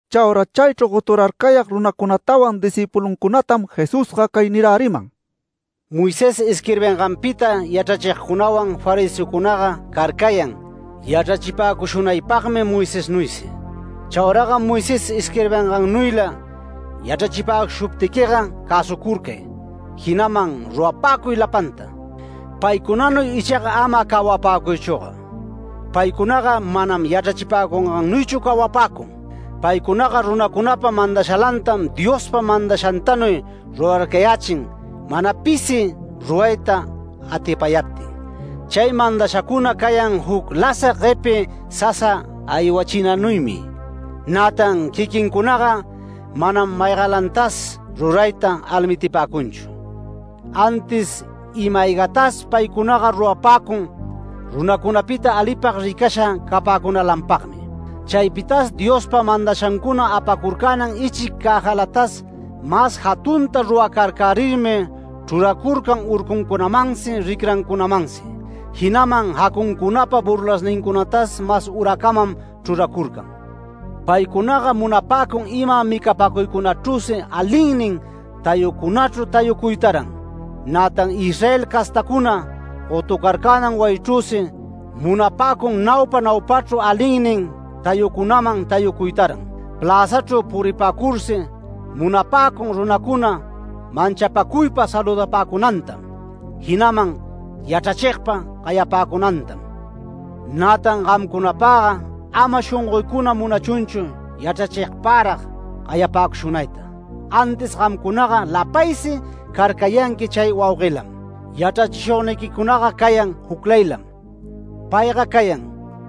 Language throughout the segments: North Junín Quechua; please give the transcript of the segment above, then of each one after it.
Chaura chaychru goturarcayag runacunatawan discïpuluncunatam Jesusga cay niräriman: “Moisés isquirbinganpita yachrachigcunawan fariseocunaga carcayan yachrachipäcushunaypagmi Moisesnuysi. Chauraga Moisés isquirbingannuyla yachrachipäcushuptiquiga cäsucurcay jinaman rurapäcuy lapanta. Paycunanuy icha ama cawapäcuychüga. Paycunaga manam yachrachipäcungannuychu cawapäcun. Paycunaga runacunapa mandashalantam Diospa mandashantanuy rurarcayächin mana pisi rurayta atipayaptin. Chay mandashacuna cayan juc lasag guepi sasa aywachinanuymi. Nätan quiquincunaga manam maygalantas rurayta almitipäcunchu. Antis ima-aygatas paycunaga rurapäcun runacunapita alipag ricasha capäcunalanpagmi. Chaypitas Diospa mandashancuna apacurcänan ichic cäjalatas mas jatunta ruracarcärirmi chruracurcan urcuncunamansi ricrancunamansi jinaman jacuncunapa burlasnincunatas mas uracamam chruracurcan. Paycunaga munapäcun ima micapäcuycunachrüsi alinnin tayucunachru tayuytaran, nätan Israel castacuna gotucarcänan wayichrüsi munapäcun naupa naupachru alinnin tayucunaman tayucuytaran. Pläzachru puripäcursi munapäcun runacuna manchapacuypa saludapäcunantam, jinaman ‘Yachrachigpa’ gayapäcunantam. Nätan gamcunapagga ama shongoycuna munachunchu yachrachigparag gayapäcushunayta, antis gamcunaga lapaysi carcayanqui chay wauguelam. Yachrachishugniquicunaga cayan juclaylam. Payga cayan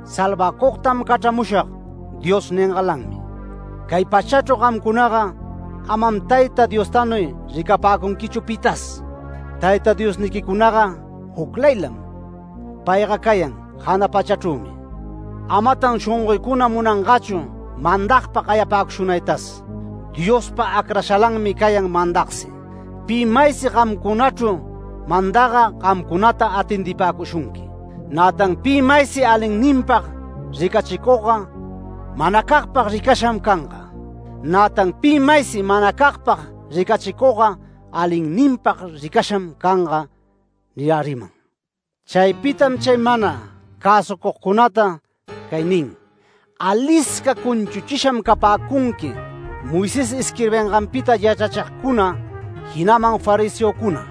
‘Salvacugtam cachramushag’ Dios ningalanmi. Cay pachachru gamcunaga amam Tayta Diostanuy ricapäcunquichu pitas. Tayta Diosniquicunaga juclaylam. Payga cayan jana pachachrümi. Amatan shongoycuna munanganchu mandagpa gayapäcushunaytas. Diospa acrashalanmi cayan mandagsi. Pi maysi gamcunachru mandagga gamcunata atendipäcushunqui. Nätan pi maysi alinninpag ricachicugga manacagpag ricasham canga. Nätan pi maysi manacagpag ricachicugga alinninpag ricasham canga” niräriman. Chaypitam chay mana cäsucugcunata cay nin: “¡Alisca cunchuchisham capäcunqui, Moisés isquirbinganpita yachrachigcuna jinaman fariseocuna!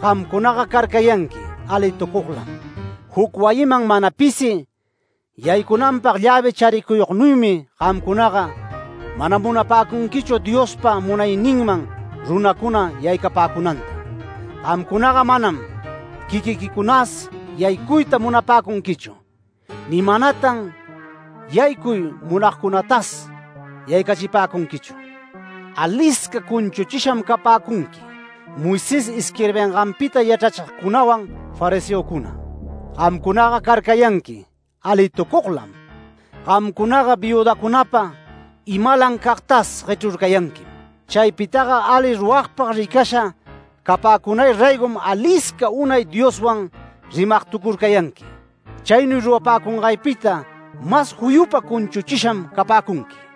¡Gamcunaga carcayanqui alitucuglam! Juc wayiman mana pisi yaycunanpag llävi charicuyugnuymi gamcunaga mana munapäcunquichu Diospa munayninman runacuna yaycapäcunanta. Gamcunaga manam quiquiquicunas yaycuyta munapäcunquichu, ni manatan yaycuy munayagcunatas yaycachipäcunquichu. [¡Alisca cunchuchisham capäcunqui, Moisés isquirbinganpita yachrachigcunawan fariseocuna! Gamcunaga carcayanqui alitucuglam. Gamcunaga viüdacunapa imalam cagtas guechrurcayanquim. Chaypitaga ali ruragpag ricasha capäcunay raygom alisca unay Dioswan rimag tucurcayanqui. Chaynuy rurapäcungaypita mas juyupa cunchuchisham capäcunqui.]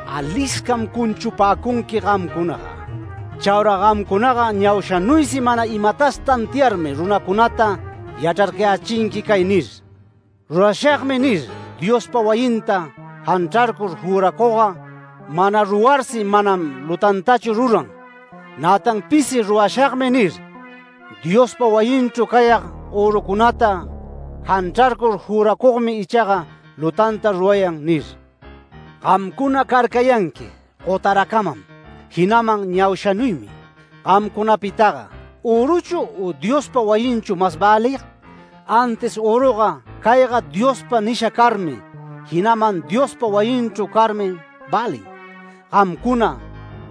¡Aliscam cunchupäcunqui gamcunaga! Chaura gamcunaga ñaushanuysi mana imatas tantiarmi runacunata yachrarcayächinqui cay nir: ‘Rurashagmi’ nir, Diospa wayinta janchrarcur juracugga mana rurarsi manam lutantachu ruran. Nätan pisi ‘Rurashagmi’ nir, ‘Diospa wayinchru cayag örucunata janchrarcur juracugmi ichaga lutanta rurayan’ nir. ¡Gamcuna carcayanqui gotaracamam, jinaman ñaushanuymi! ¿Gamcunapitaga öruchu u Diospa wayinchu mas välig? Antis öruga ‘Cayga Diospag nisha carmi’, jinaman Diospa wayinchru carmi välin. Gamcuna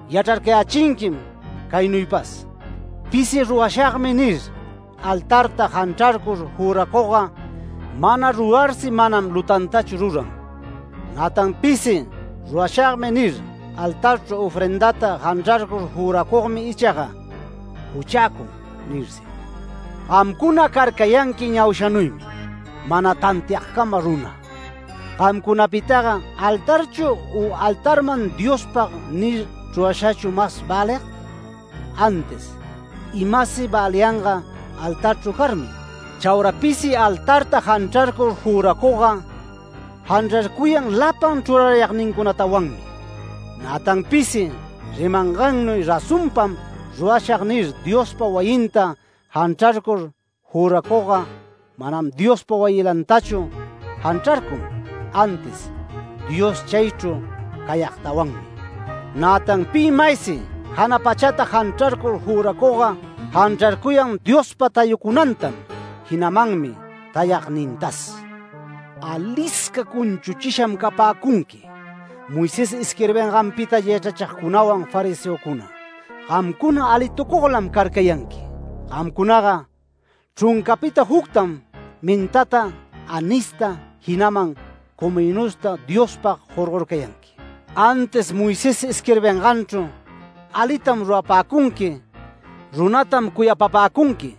yachrarcayächinquim caynuypas: Pisi ‘Rurashagmi’ nir altarta janchrarcur juracugga mana rurarsi manam lutantachu rurarun. Nätan pisi ‘Rurashagmi’ nir, ‘Altarchru ofrendata janchrarcur juracugmi ichaga juchäcun’ nirsi. ¡Gamcuna carcayanqui ñaushanuymi mana tantiagcama runa! ¿Gamcunapitaga altarchu u altarman ‘Diospag’ nir chrurashachu mas välig? Antis imasi väliyanga altarchru carmi. Chaura pisi altarta janchrarcur juracugga janchrarcuyan lapan chrurarayagnintawanmi. Nätan pisi ‘Rimangannuy razonpam rurashag’ nir Diospa wayinta janchrarcur juracugga manam Diospa wayilantachu janchrarcun, antis Dios chaychru cayagtawanmi. Nätan pi maysi jana pachata janchrarcur juracugga janchrarcuyan Diospa tayacunantam jinamanmi tayagnintas. ¡Alisca cunchuchisham capäcunqui, Moisés isquirbinganpita yachrachigcunawan fariseocuna! ¡Gamcuna alitucuglam carcayanqui! Gamcunaga chruncapita juctam mentata anista jinaman cominosta Diospag jorgorcayanqui. Antis Moisés isquirbinganchru ‘Alitam rurapäcunqui, runatam cuyapapäcunqui,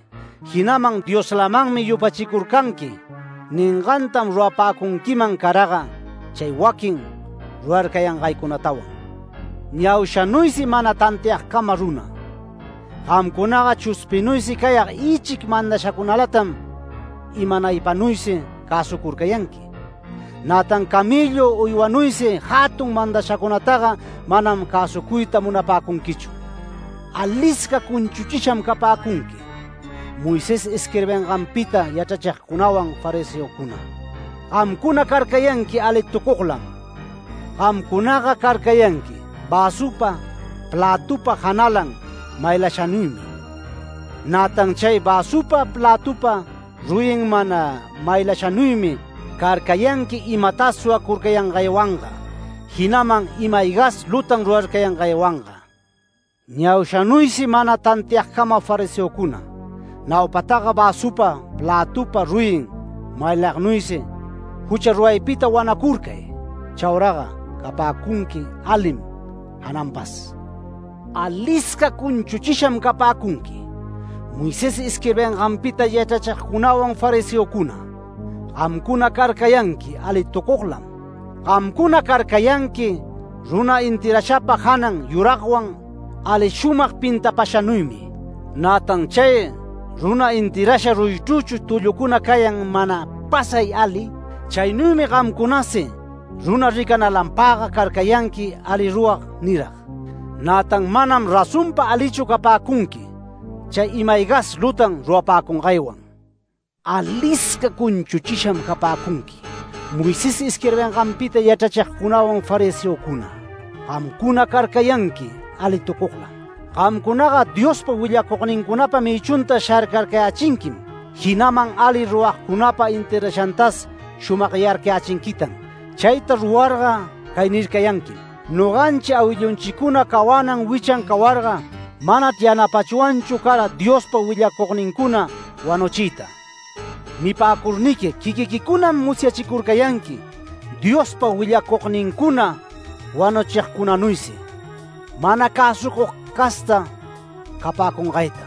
jinaman Dioslamanmi yupachicurcanqui’ ningantam rurapäcunquiman caraga chay waquin rurarcayangaycunatawan. ¡Ñaushanuysi mana tantiagcama runa! Gamcunaga chuspinuysi cayag ichic mandashacunalatam imanaypanuysi cäsucurcayanqui, nätan camellu uywanuysi jatun mandashacunataga manam cäsucuyta munapäcunquichu. ¡Alisca cunchuchisham capäcunqui, Moisés isquirbinganpita yachrachigcunawan fariseocuna! ¡Gamcuna carcayanqui alitucuglam! Gamcunaga carcayanqui väsupa plätupa janalan maylashanuymi, nätan chay väsupa plätupa ruyin mana maylashanuymi carcayanqui imatas suwacurcayangaywanga, jinaman ima-aygas lutan rurarcayangaywanga. ¡Ñaushanuysi mana tantiagcama fariseocuna! Naupataga väsupa plätupa ruyin maylagnuysi jucha ruraypita wanacurcay. Chauraga capäcunqui alim jananpas. ¡Alisca cunchuchisham capäcunqui, Moisés isquirbinganpita yachrachigcunawan fariseocuna! ¡Gamcuna carcayanqui alitucuglam! Gamcuna carcayanqui runa enterrashapa janan yuragwan ali shumag pintapashanuymi, nätan chay runa enterrasha ruyichrüchu tullucuna cayan mana pasay ali. Chaynuymi gamcunasi runa ricanalanpagga carcayanqui ali rurag nirag. Nätan manam razonpa alichu capäcunqui chay ima-aygas lutan rurapäcungaywan. ¡Alisca cunchuchisham capäcunqui, Moisés isquirbinganpita yachrachigcunawan fariseocuna! ¡Gamcuna carcayanqui alitucuglam! Gamcunaga Diospa willacugnincunapa mïchunta sharcarcayächinquim, jinaman ali ruragcunapa enterrashantas shumagyarcayächinquitan. Chayta rurarga cay nircayanquim: ‘Noganchi awillunchicuna cawanan wichan cawarga manachr yanapachwanchu cara Diospa willacugnincuna wanuchiyta’. Nipäcurniqui quiquiquicunam musyachicurcayanqui Diospa willacugnincuna wanuchigcunanuysi mana cäsucug casta capäcungayta.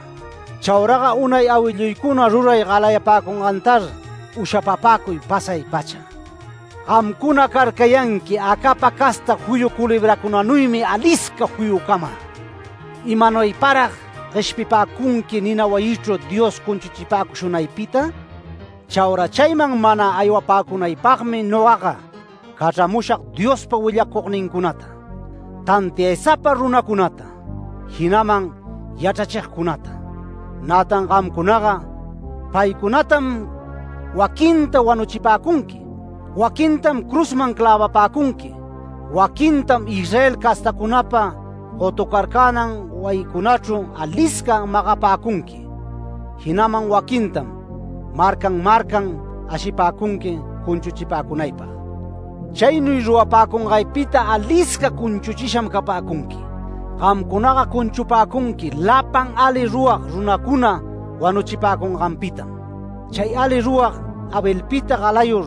Chauraga unay awilluycuna ruray galayapäcungantar ushapapäcuy pasay-pacha. ¡Gamcuna carcayanqui acapa casta juyu culebracunanuymi alisca juyucama! ¿Imanuyparag gueshpipäcunqui nina wayichru Dios cunchuchipäcushunaypita? Chaura chayman mana aywapäcunaypagmi nogaga cachramushag Diospa willacugnincunata, tantiaysapa runacunata, jinaman yachrachigcunata. Nätan gamcunaga paycunatam waquinta wanuchipäcunqui, waquintam cruzman clävapäcunqui, waquintam Israel castacunapa gotucarcänan wayincunachru alisca magapäcunqui. Jinaman waquintam marcan marcan ashipäcunqui cunchuchipäcunaypag. Chaynuy rurapäcungaypita alisca cunchuchisham capäcunqui. Gamcunaga cunchupäcunqui lapan ali rurag runacuna wanuchipäcunganpitam, chay ali rurag Abelpita galayur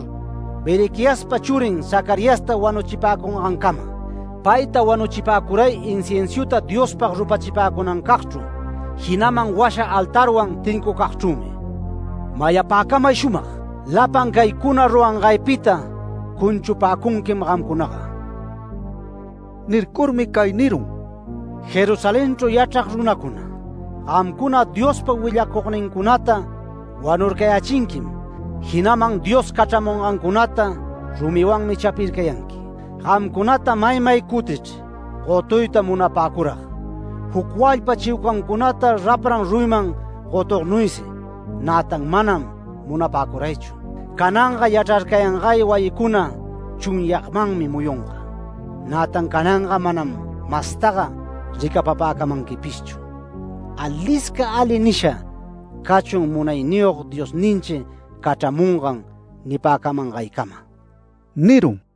Berequiaspa churin Zacariasta wanuchipäcungaycamam. Payta wanuchipäcuray inciensuta Diospag rupachicunacagchru jinaman washa altarwan tincucugchrümi. Mayapäcamay shumag: Lapan caycuna rurangaypita cunchupäcunquim gamcunaga”. Nircurmi cay nirun: “¡Jerusalenchru yachrag runacuna, gamcuna Diospa willacugnincunata wanurcayächinquim, jinaman Dios cachramungancunata rumiwanmi chapircayanqui! Gamcunata maymay cutichr gotuyta munapäcurag, juc walpa chiucancunata rapran ruyiman gotugnuysi, nätan manam munapäcuraychu. Cananga yachrarcayangay wayiquicuna chunyagmanmi muyunga. Nätan cananga manam mastaga ricapapäcamanquipishchu ‘Alisca ali nisha cachun Munayniyog Diosninchi cachramungan’ nipäcamänaycama” nirun.